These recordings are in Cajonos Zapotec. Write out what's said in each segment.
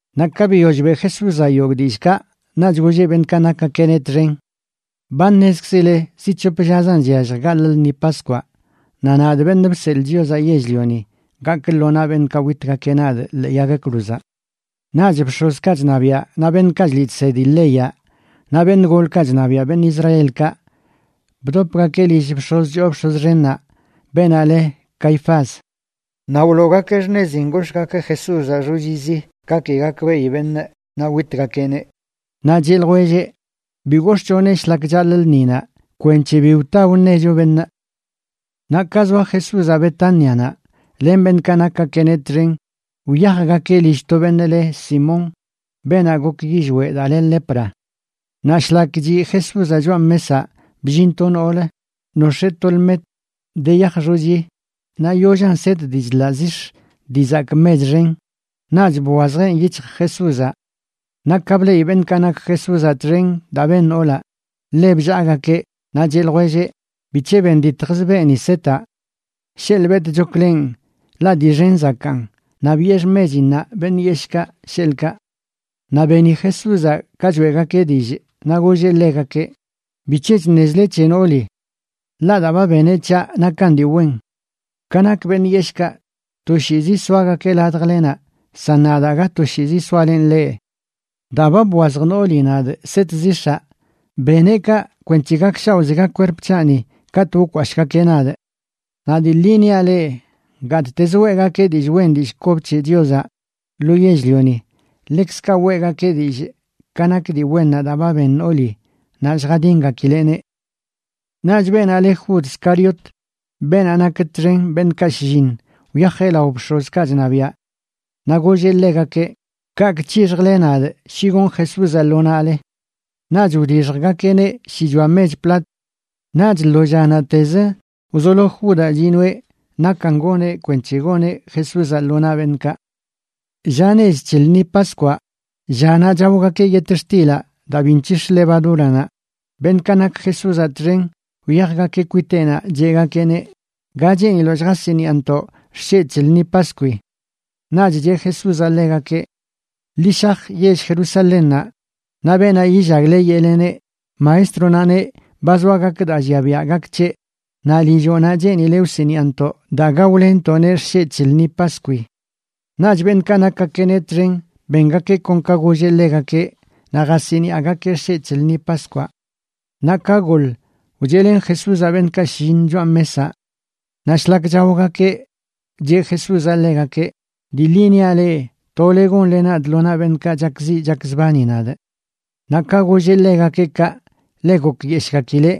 Naꞌ ka biyoll beꞌ Jesúzaꞌ yogꞌ dillꞌkaꞌ, naꞌch golleꞌ beṉꞌkaꞌ nakgakeꞌneꞌ txen: ―Ba ṉezkzile zi c̱hop llazan chyallj gaḻꞌ lṉi Paskwaꞌ, naꞌ nadꞌ, Beṉꞌ Bseḻꞌ Chiozaꞌ Yell-lioni, gakꞌ lo naꞌ beṉꞌkaꞌ witgakeꞌ nadꞌ ḻee yag cruzaꞌ. Naꞌch bx̱ozkaꞌ chṉabiaꞌ naꞌ beṉꞌkaꞌ chliꞌ chsedi leyaꞌ naꞌ beṉꞌ golkaꞌ chṉabiaꞌ beṉꞌ Israelkaꞌ bdopgakeꞌ lill bx̱oz choo bx̱oz xennaꞌ, beenaꞌ le Caifás. Naꞌ wloogakeꞌ xṉezin gox̱ꞌgakeꞌ Jesúzaꞌ xochizi, ka ki gakbeꞌi beṉꞌ, naꞌ witgakeꞌneꞌ. Naꞌ cheꞌ ljwelleꞌ: ―Bi gox̱ꞌchoneꞌ shlak chaḻꞌ lṉinaꞌ kwenc̱he bi wta wṉecho beṉꞌ. Naꞌ ka zoa Jesúzaꞌ Betánianaꞌ len beṉꞌkaꞌ nakgakeꞌneꞌ txen, wyajgakeꞌ lill to beṉꞌ leꞌ Simón, beenaꞌ gok yillweꞌ daa le lepra. Naꞌ shlak chiꞌ Jesúzaꞌ choꞌa mesaꞌ, bllin to noolə nox̱ee to lmet de yaj xochi naꞌ yollan set dii chḻaꞌ zix̱ dii zakꞌ mech xen, naꞌch bwazjeꞌn yic̱hj Jesúzaꞌ. Naꞌ ka bleꞌi beṉꞌkaꞌ nak Jesúzaꞌ txen daa ben noolaꞌ, ḻe bllaagakeꞌ naꞌ cheꞌ ljwelleꞌ: ―¿Bic̱he benditjz beeni setaꞌ? Sheḻꞌ betꞌchokleꞌn, ḻaꞌ dii xen zakaan, naꞌ biꞌe xmechinnaꞌ beṉꞌ yeshꞌkaꞌ, sheḻꞌkaꞌ. Naꞌ beni Jesúzaꞌ ka choeꞌgakeꞌ dillꞌ, naꞌ golleꞌ ḻegakeꞌ: ―¿Bic̱he chṉezle c̱he nooli? Ḻaꞌ daa ba beneꞌ c̱haꞌ nakan dii wen. Ka nak beṉꞌ yeshꞌkaꞌ, toshiizi soagakeꞌ ladjlenaꞌ, san nadꞌ, aga toshiizi soalenꞌ leꞌ. Daa ba bwazj nooli nadꞌ set zix̱aꞌ, beneꞌ kaꞌ kwenc̱he gakshaoꞌzega kwerp c̱haꞌni katꞌ wkwashꞌgakeꞌ nadꞌ. Naꞌ dii ḻi niaꞌ leꞌ, gattezə weꞌgakeꞌ dillꞌ wen dillꞌ kob c̱he Chiozaꞌ lo yell-lioni, ḻekzkaꞌ weꞌgakeꞌ dillꞌ ka nak dii wennaꞌ daa ba ben nooli naꞌ lljadingakileꞌneꞌ. Naꞌch beenaꞌ le Jud Scariot, beenaꞌ nak txen beṉꞌkaꞌ shlliṉ, wyajeꞌ lao bx̱ozkaꞌ chṉabiaꞌ. Naꞌ golleꞌ ḻegakeꞌ: ―¿Kaꞌkꞌ c̱hixjle nadꞌ shi gonꞌ Jesúzaꞌ lo naꞌle? Naꞌch wdixjgakeꞌneꞌ shichoa mech plat. Naꞌch lo llanaꞌtez wzolo Judaꞌ chinoeꞌ nakan goneꞌ kwenc̱he goneꞌ Jesúzaꞌ lo naꞌ beṉꞌkaꞌ. Lla nech c̱he lṉi Paskwaꞌ, llanaꞌ chaogakeꞌ yetxtilaꞌ daa bi nc̱hix̱ levadúranaꞌ, beṉꞌkaꞌ nak Jesúzaꞌ txen wyajgakeꞌ kwiteꞌnaꞌ cheꞌgakeꞌneꞌ: ―¿Ga cheeniloꞌ lljasiniꞌantoꞌ xsheꞌ c̱he lṉi Paskwi? Naꞌch cheꞌ Jesúzaꞌ ḻegakeꞌ: ―Ḻi shaj yell Jerusalénnaꞌ, naꞌ beenaꞌ yillagle yeꞌleneꞌ: “Maestronaꞌ neꞌ ba zoa gak daa llia biaꞌ gak c̱heꞌ, naꞌ lilloꞌnaꞌ cheenileꞌ wsiniꞌantoꞌ daa gaolenntoꞌneꞌ xsheꞌ c̱he lṉi Paskwi.” Naꞌch beṉꞌkaꞌ nakgakeꞌneꞌ txen bengakeꞌ kon ka golleꞌ ḻegakeꞌ, naꞌ jasiniꞌagakeꞌ xsheꞌ c̱he lṉi Paskwaꞌ. Naꞌ ka goḻ, wcheꞌlen Jesúzaꞌ beṉꞌkaꞌ shlliṉ choꞌa mesaꞌ. Naꞌ shlak chaogakeꞌ cheꞌ Jesúzaꞌ ḻegakeꞌ: ―Dii ḻi niaꞌ leꞌ, tole gonle nadꞌ lo naꞌ beṉꞌkaꞌ chakziꞌ chakzbani nadꞌ. Naꞌ ka golleꞌ ḻegakeꞌ kaꞌ ḻe gokyeshꞌgakileꞌ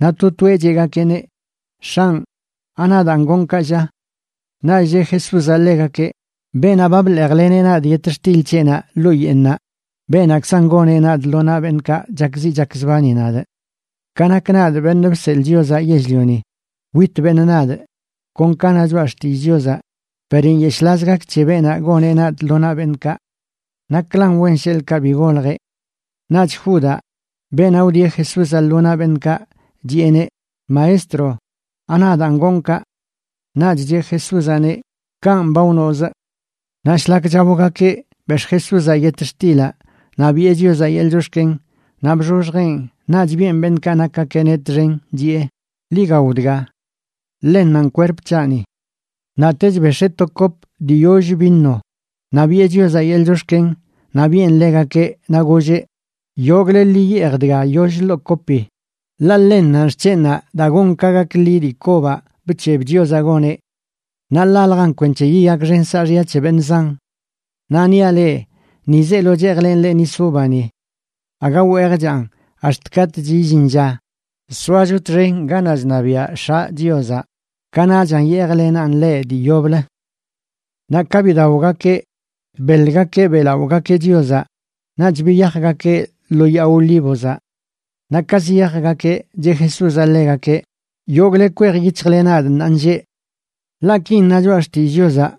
naꞌ to toeꞌ cheꞌgakeꞌneꞌ: ―X̱anꞌ, ¿anadaan gonꞌ kaꞌ, lla? Naꞌch cheꞌ Jesúzaꞌ ḻegakeꞌ: ―Beenaꞌ ba bḻeejleneꞌ nadꞌ yetxtil c̱heꞌnaꞌ ḻoo yeeṉaꞌ, beenaꞌkzanꞌ goneꞌ nadꞌ lo naꞌ beṉꞌkaꞌ chakziꞌ chakzbani nadꞌ. Ka nak nadꞌ, Beṉꞌ Bseḻꞌ Chiozaꞌ Yell-lioni, wit beṉꞌ nadꞌ kon ka na Choꞌa Xtillꞌ Chiozaꞌ, per ¡nyeshꞌlaz gak c̱he beenaꞌ goneꞌ nadꞌ lo naꞌ beṉꞌkaꞌ! ¡Naklan wen sheḻꞌkaꞌ bi goljeꞌ! Naꞌch Judaꞌ, beenaꞌ wdieꞌ Jesúzaꞌ lo naꞌ beṉꞌkaꞌ, chiꞌeneꞌ: ―Maestro, ¿anadaan gonꞌ kaꞌ? Naꞌch cheꞌ Jesúzaꞌneꞌ: ―Kanꞌ ba wnoꞌz. Naꞌ shlak chaogakeꞌ, bex̱ꞌ Jesúzaꞌ yetxtilaꞌ naꞌ biꞌe Chiozaꞌ yeḻꞌ chox̱ken, naꞌ bxoxjeꞌn naꞌch biꞌen beṉꞌkaꞌ nakgakeꞌneꞌ txen, chiꞌe: ―Ḻi gao dga. Ḻennanꞌ kwerp c̱haꞌni. Naꞌtech bex̱ee to kop dii yoll vino, naꞌ biꞌe Chiozaꞌ yeḻꞌ chox̱ken naꞌ biꞌen ḻegakeꞌ, naꞌ golleꞌ: ―Yogꞌle ḻi yeej dga yoll ḻoo kopi, ḻaꞌ ḻennanꞌ xc̱henꞌnaꞌ daa gon ka gak ḻi dii kobaꞌ bc̱heb Chiozaꞌ goneꞌ. Naꞌ ḻaljan kwenc̱he yiyakxen saaxya c̱he beṉꞌ zan. Naꞌ niaꞌ leꞌ, ni zeelo cheejlenꞌ leꞌ nis uvani. Aga weejchaꞌn ax̱t katꞌch illin lla soacho txen ganaꞌ chṉabiaꞌ X̱aꞌ Chiozaꞌ, kanaꞌchan yeejlenaꞌn leꞌ dii yoblə. Naꞌ ka bidaogakeꞌ, beḻgakeꞌ beꞌlaꞌogakeꞌ Chiozaꞌ naꞌch biyajgakeꞌ lo yaa Olívozaꞌ. Naꞌ ka ziyajgakeꞌ, cheꞌ Jesúzaꞌ ḻegakeꞌ: ―Yogꞌle kwej yic̱hjle nadꞌ ṉaanlleꞌ. Ḻaꞌ kin na Choꞌa Xtillꞌ Chiozaꞌ: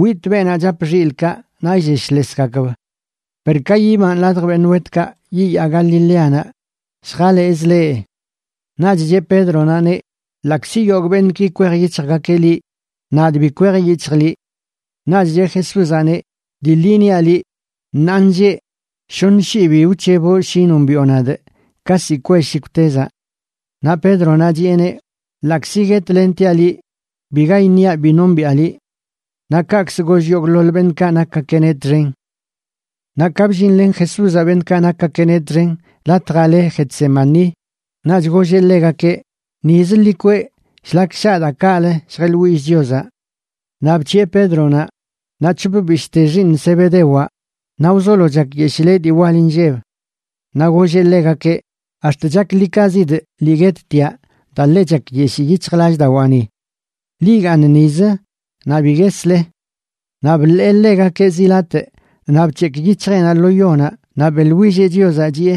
“Witꞌ beenaꞌ chap xilꞌkaꞌ naꞌ illeshlesgakb.” Per ka yibanꞌ ladj beṉꞌ wetkaꞌ, yiyaa Galileanaꞌ lljalezꞌ leꞌ. Naꞌch cheꞌ Pédronaꞌneꞌ: ―Ḻaꞌkzi yogꞌ beṉꞌki kwej yic̱hjgakeꞌ liꞌ, nadꞌ bi kwej yic̱hjꞌ liꞌ. Naꞌch cheꞌ Jesúzaꞌneꞌ: ―Dii ḻi niaꞌ liꞌ, ṉaanlleꞌ shoṉ shii bi wc̱heboꞌ shi nombiꞌo nadꞌ ka ziꞌ kwell shikwtezaꞌ. Naꞌ Pédronaꞌ chiꞌeneꞌ: ―Ḻaꞌkzi guetlentiaꞌ liꞌ, biga iṉiaꞌ bi nombiꞌa liꞌ. Naꞌ kaꞌkzə goll yogꞌḻoḻ beṉꞌkaꞌ nakgakeꞌneꞌ txen. Naꞌ ka bllinlen Jesúzaꞌ beṉꞌkaꞌ nakgakeꞌneꞌ txen latjaꞌ le Getsemaní, naꞌch golleꞌ ḻegakeꞌ: ―Nizə ḻi kweꞌ shlak shaa daa kaꞌlə lljeꞌḻwillꞌ Chiozaꞌ. Naꞌ bc̱hiꞌe Pédronaꞌ naꞌ c̱hop bishꞌte xiiṉ Zebedewaꞌ, naꞌ wzolo chakyeshileꞌ dii wal inlleb. Naꞌ golleꞌ ḻegakeꞌ: ―Ax̱t chaklikazidꞌ lii guettiaꞌ daa ḻe chakyeshii yic̱hjlallꞌdawaani. Ḻi igaaṉ nizə naꞌ bi guesle. Naꞌ bḻee ḻegakeꞌ zi latꞌ naꞌ bc̱hekꞌ yic̱hjeꞌnaꞌ lo yonaꞌ naꞌ beꞌḻwilleꞌ Chiozaꞌ, chiꞌe: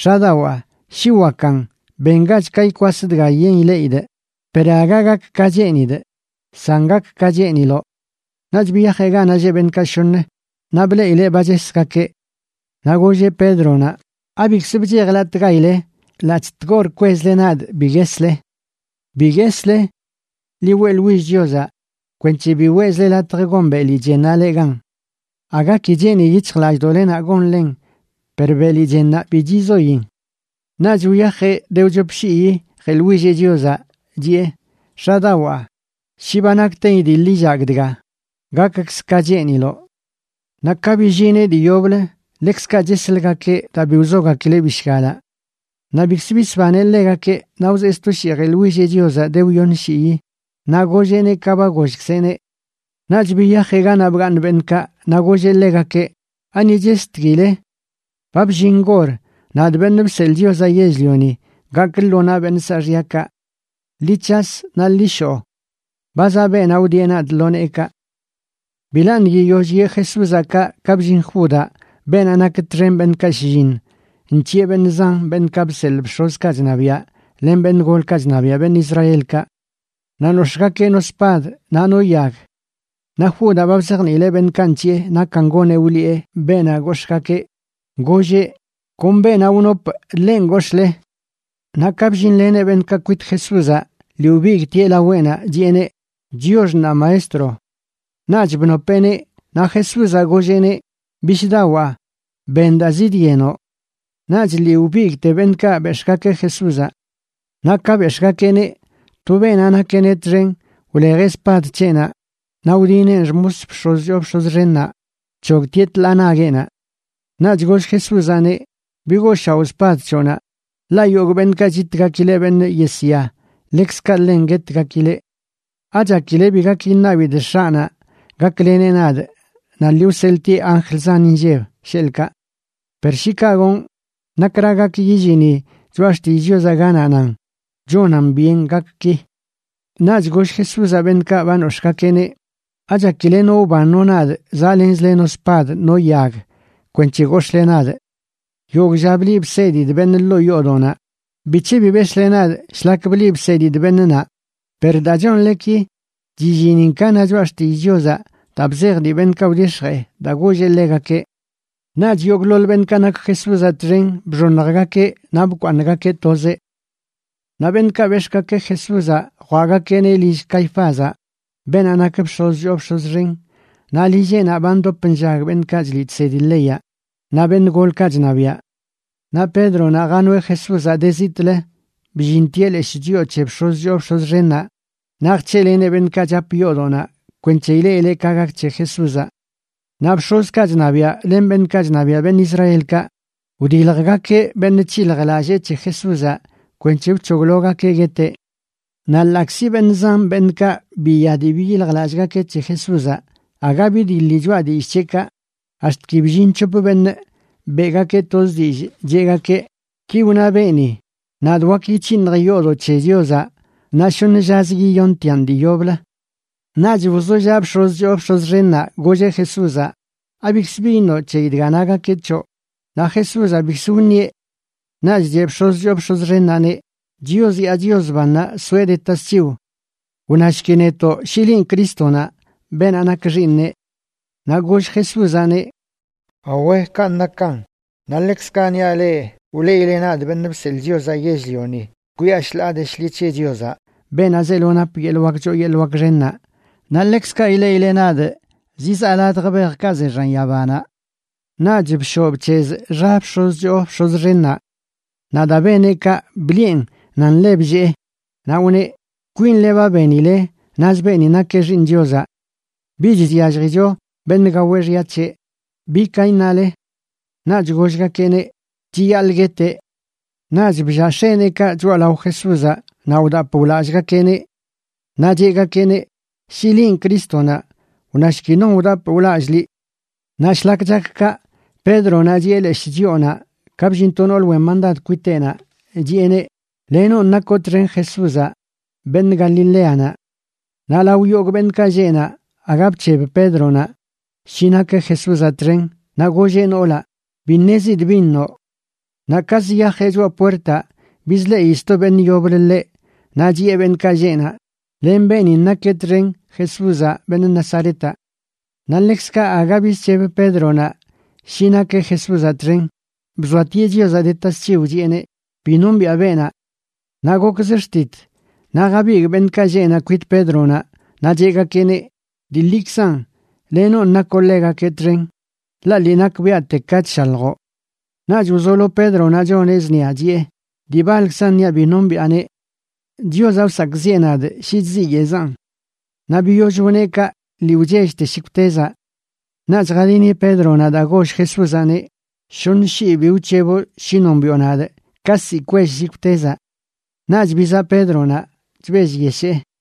―X̱adawaa, shi wakan, bengach ka ikwas dga yen ileꞌidꞌ, per aga gak ka cheenidꞌ, san gak ka cheeniloꞌ. Naꞌch biyajeꞌ ganaꞌ lleꞌ beṉꞌkaꞌ shoṉ, naꞌ bleꞌileꞌ ba chesgakeꞌ. Naꞌ golleꞌ Pédronaꞌ: ―¿Abikzə bchejlatꞌgaile ḻaꞌc̱hꞌ tgor kwezle nadꞌ bi guesle? Bi guesle. Ḻi weꞌḻwill Chiozaꞌ kwenc̱he bi weꞌzle latj gon beli chennaꞌ leꞌ gan. Aga ki cheeni yic̱hjlallꞌdoꞌlenaꞌ gonlen per beli chennaꞌ bi chizoin. Naꞌch wyajeꞌ de wchop shii jeḻwilleꞌ Chiozaꞌ, chiꞌe: ―X̱adawaa, shi ba nakten idiḻ illagꞌ dga, gakkzə ka cheeniloꞌ. Naꞌ ka billineꞌ dii yoblə ḻekzkaꞌ chesləgakeꞌ daa bi wzogakileꞌ bishgalaꞌ. Naꞌ bikzə bisbaneꞌ ḻegakeꞌ, naꞌ wzee sto shii jeḻwilleꞌ Chiozaꞌ de wyoṉ shii naꞌ golleꞌneꞌ ka ba gollkzeꞌneꞌ. Naꞌch biyajeꞌ ganaꞌ bgaaṉ beṉꞌkaꞌ, naꞌ golleꞌ ḻegakeꞌ: ―¿Ani chestkile? Ba bllin gor nadꞌ, Beṉꞌ Bseḻꞌ Chiozaꞌ Yell-lioni, gakꞌ lo naꞌ beṉꞌ saaxyakaꞌ. Ḻi c̱has naꞌ ḻi shoꞌ. Ba zaꞌ beenaꞌ wdieꞌ nadꞌ lo neekaꞌ. Bilaṉꞌ yiyoll yee Jesúzaꞌ kaꞌ ka bllin Judaꞌ beenaꞌ nak txen beṉꞌkaꞌ shlliṉ, nc̱hiꞌe beṉꞌ zan beṉꞌkaꞌ bseḻꞌ bx̱ozkaꞌ chṉabiaꞌ len beṉꞌ golkaꞌ chṉabiaꞌ beṉꞌ Israelkaꞌ. Naꞌ nox̱ꞌgakeꞌ no spad naꞌ no yag. Naꞌ Judaꞌ ba bzajniileꞌ beṉꞌkaꞌ nc̱hiꞌe nakan goneꞌ wliꞌe beenaꞌ gox̱ꞌgakeꞌ, golleꞌ: “Kon beenaꞌ wnopꞌ, ḻen gox̱ꞌle.” Naꞌ ka bllinleneꞌ beṉꞌkaꞌ kwit Jesúzaꞌ, lii wbigꞌtieꞌ laweꞌnaꞌ chiꞌeneꞌ: ―¡Chiox ṉaa, maestro! Naꞌch bnopeꞌneꞌ. Naꞌ Jesúzaꞌ golleꞌneꞌ: ―Bishꞌdawaa, ben daa zidyenoꞌ. Naꞌch lii wbigꞌte beṉꞌkaꞌ bex̱ꞌgakeꞌ Jesúzaꞌ. Naꞌ ka bex̱ꞌgakeꞌneꞌ, to beenaꞌ nakeꞌneꞌ txen wlejeꞌ spad c̱heꞌnaꞌ naꞌ wdineꞌn xmos bx̱oz choo bx̱oz xennaꞌ, bc̱hogtieꞌ tḻaa nagueꞌnaꞌ. Naꞌch goll Jesúzaꞌneꞌ: ―Bigooshaoꞌ spad c̱hoꞌnaꞌ, ḻaꞌ yogꞌ beṉꞌkaꞌ chitgakileꞌ beṉꞌ yesya, ḻekzkaꞌ ḻen guetgakileꞌ. ¿Achakile bi gak iṉabidꞌ X̱aꞌnaꞌ gakleneꞌ nadꞌ naꞌ lii wseḻꞌtieꞌ anjl zan inlleb, sheḻꞌkaꞌ? Per shi kaꞌ gonꞌ, ¿nakra gak yillini Choꞌa Xtillꞌ Chiozaꞌ ganaꞌ nan chonan byen gak ki? Naꞌch goll Jesúzaꞌ beṉꞌkaꞌ ba nox̱ꞌgakeꞌneꞌ: ―¿Achakileꞌ no wban no nadꞌ zaꞌlenzle no spad no yag kwenc̱he gox̱ꞌle nadꞌ? Yogꞌ lla bliꞌ bsedidꞌ beṉꞌ ḻoo yoodoꞌnaꞌ, ¿bic̱he bi bex̱ꞌle nadꞌ shlak bliꞌ bsedidꞌ beṉꞌ naꞌ? Per daa chonle ki, chillinin ka na Choꞌa Xtillꞌ Chiozaꞌ daa bzej dii beṉꞌkaꞌ wdix̱jee daa golleꞌ ḻegakeꞌ. Naꞌch yogꞌḻoḻ beṉꞌkaꞌ nak Jesúzaꞌ txen bxoṉjgakeꞌ naꞌ bkwaaṉꞌgakeꞌ tozeꞌ. Naꞌ beṉꞌkaꞌ bex̱ꞌgakeꞌ Jesúzaꞌ jwaꞌgakeꞌneꞌ lill Caifázaꞌ, beenaꞌ nak bx̱oz choo bx̱oz xen, naꞌ lilleꞌnaꞌ ba ndop nllag beṉꞌkaꞌ chliꞌ chsedi leyaꞌ naꞌ beṉꞌ golkaꞌ chṉabiaꞌ. Naꞌ Pédronaꞌ janoeꞌ Jesúzaꞌ de zitꞌlə, bllintieꞌ leshꞌ chyoo c̱he bx̱oz choo bx̱oz xennaꞌ naꞌ jc̱heꞌleneꞌ beṉꞌkaꞌ chap yoodoꞌnaꞌ kwenc̱he ileꞌileꞌ ka gak c̱he Jesúzaꞌ. Naꞌ bx̱ozkaꞌ chṉabiaꞌ len beṉꞌkaꞌ chṉabiaꞌ beṉꞌ Israelkaꞌ wdiljgakeꞌ beṉꞌ c̱hiljlallee c̱he Jesúzaꞌ kwenc̱he wc̱hoglogakeꞌ gueteꞌ. Naꞌ ḻaꞌkzi beṉꞌ zan beṉꞌkaꞌ biya dii biyiljlallꞌgakeꞌ c̱he Jesúzaꞌ, aga bidiḻi choꞌa dillꞌ c̱heꞌkaꞌ, ax̱t ki bllin c̱hop beṉꞌ beꞌgakeꞌ toz dillꞌ, cheꞌgakeꞌ: ―Ki wna beeni: “Nadꞌ wak yic̱hinjꞌ yoodoꞌ c̱he Chiozaꞌ naꞌ shoṉ llazə yiyontiaꞌn dii yoblə.” Naꞌch wzollaꞌ bx̱oz choo bx̱oz xennaꞌ, golleꞌ Jesúzaꞌ: ―¿Abikz bi iṉoꞌ c̱heyi dga nagakeꞌ c̱hoꞌ? Naꞌ Jesúzaꞌ bikzə wṉieꞌ. Naꞌch cheꞌ bx̱oz choo bx̱oz xennaꞌneꞌ: ―Chios yaa Chios bannaꞌ soeꞌ de tasc̱hiw. Wnashki netoꞌ shi linꞌ Crístonaꞌ, beenaꞌ nak Xiiṉeꞌ. Naꞌ goll Jesúzaꞌneꞌ: ―Awe, kanꞌ nakan. Naꞌ ḻekzkaꞌ niaꞌ leꞌ, wleꞌile nadꞌ, Beṉꞌ Bseḻꞌ Chiozaꞌ Yell-lioni, kwiꞌa shḻaa de shḻi c̱he Chiozaꞌ, beenaꞌ zeelo nap yeḻꞌ wak choo yeḻꞌ wak xennaꞌ, naꞌ ḻekzkaꞌ ileꞌile nadꞌ zizaa ladj bejkaꞌ ze xan yabanaꞌ. Naꞌch bshoꞌ bc̱hezꞌ xa bx̱oz choo bx̱oz xennaꞌ. Naꞌ daa beneꞌ kaꞌ, bliꞌe nan ḻe bllee, naꞌ wne: ―¡Kwinle ba benile naz beeni nakeꞌ Xiiṉ Chiozaꞌ! Bich chyalljicho beṉꞌ gao xya c̱heꞌ. ¿Bi ka iṉale? Naꞌch gollgakeꞌneꞌ: ―Chiyaḻꞌ gueteꞌ. Naꞌch bllaa x̱eneekaꞌ choꞌalao Jesúzaꞌ naꞌ wdapꞌ wlallꞌgakeꞌneꞌ. Naꞌ cheꞌgakeꞌneꞌ: ―Shi linꞌ Crístonaꞌ, wnashki non wdap wlallꞌ liꞌ. Naꞌ shlak chak kaꞌ, Pédronaꞌ chiꞌe leshꞌ chyoonaꞌ ka bllin to noolə wen mandad kwiteꞌnaꞌ chiꞌeneꞌ: ―Lenonꞌ nakoꞌ txen Jesúzaꞌ, beṉꞌ Galileanaꞌ. Naꞌ lao yogꞌ beṉꞌkaꞌ lleꞌ naꞌ, aga bc̱heb Pédronaꞌ shi nakeꞌ Jesúzaꞌ txen, naꞌ golleꞌ noolaꞌ: ―Bi ṉezidꞌ bin noꞌ. Naꞌ ka ziyajeꞌ choꞌa puertaꞌ bizleꞌi sto beṉꞌ yoblə ḻeꞌ naꞌ chiꞌe beṉꞌkaꞌ lleꞌ naꞌ: ―Len beenin nakeꞌ txen Jesúzaꞌ, beṉꞌ Nazaretaꞌ. Naꞌ ḻekzkaꞌ aga bizc̱heb Pédronaꞌ shi nakeꞌ Jesúzaꞌ txen, bzoatieꞌ Chiozaꞌ de tasc̱hiw, chiꞌeneꞌ: ―Bi nombiꞌa beenaꞌ. Naꞌ gokzə xtit naꞌ jabigꞌ beṉꞌkaꞌ lleꞌ naꞌ kwit Pédronaꞌ naꞌ cheꞌgakeꞌneꞌ: ―Dii ḻikzan lenonꞌ nakoꞌ ḻegakeꞌ txen, ḻaꞌ lii nakbiaꞌte ka chshaljoꞌ. Naꞌch wzolo Pédronaꞌ choneꞌ zṉia, chiꞌe: ―¡Dii baḻkzan niaꞌ bi nombiꞌaneꞌ! ¡Chiozaꞌ wsakꞌziꞌe nadꞌ shi chziyeꞌzanꞌ! Naꞌ biyoll wneꞌ kaꞌ lii wchellte shikwtezaꞌ. Naꞌch jadini Pédronaꞌ daa goll Jesúzaꞌneꞌ: “Shoṉ shii bi wc̱heboꞌ shi nombiꞌo nadꞌ ka ziꞌ kwell shikwtezaꞌ.” Naꞌch bizaꞌ Pédronaꞌ chbellyeshee.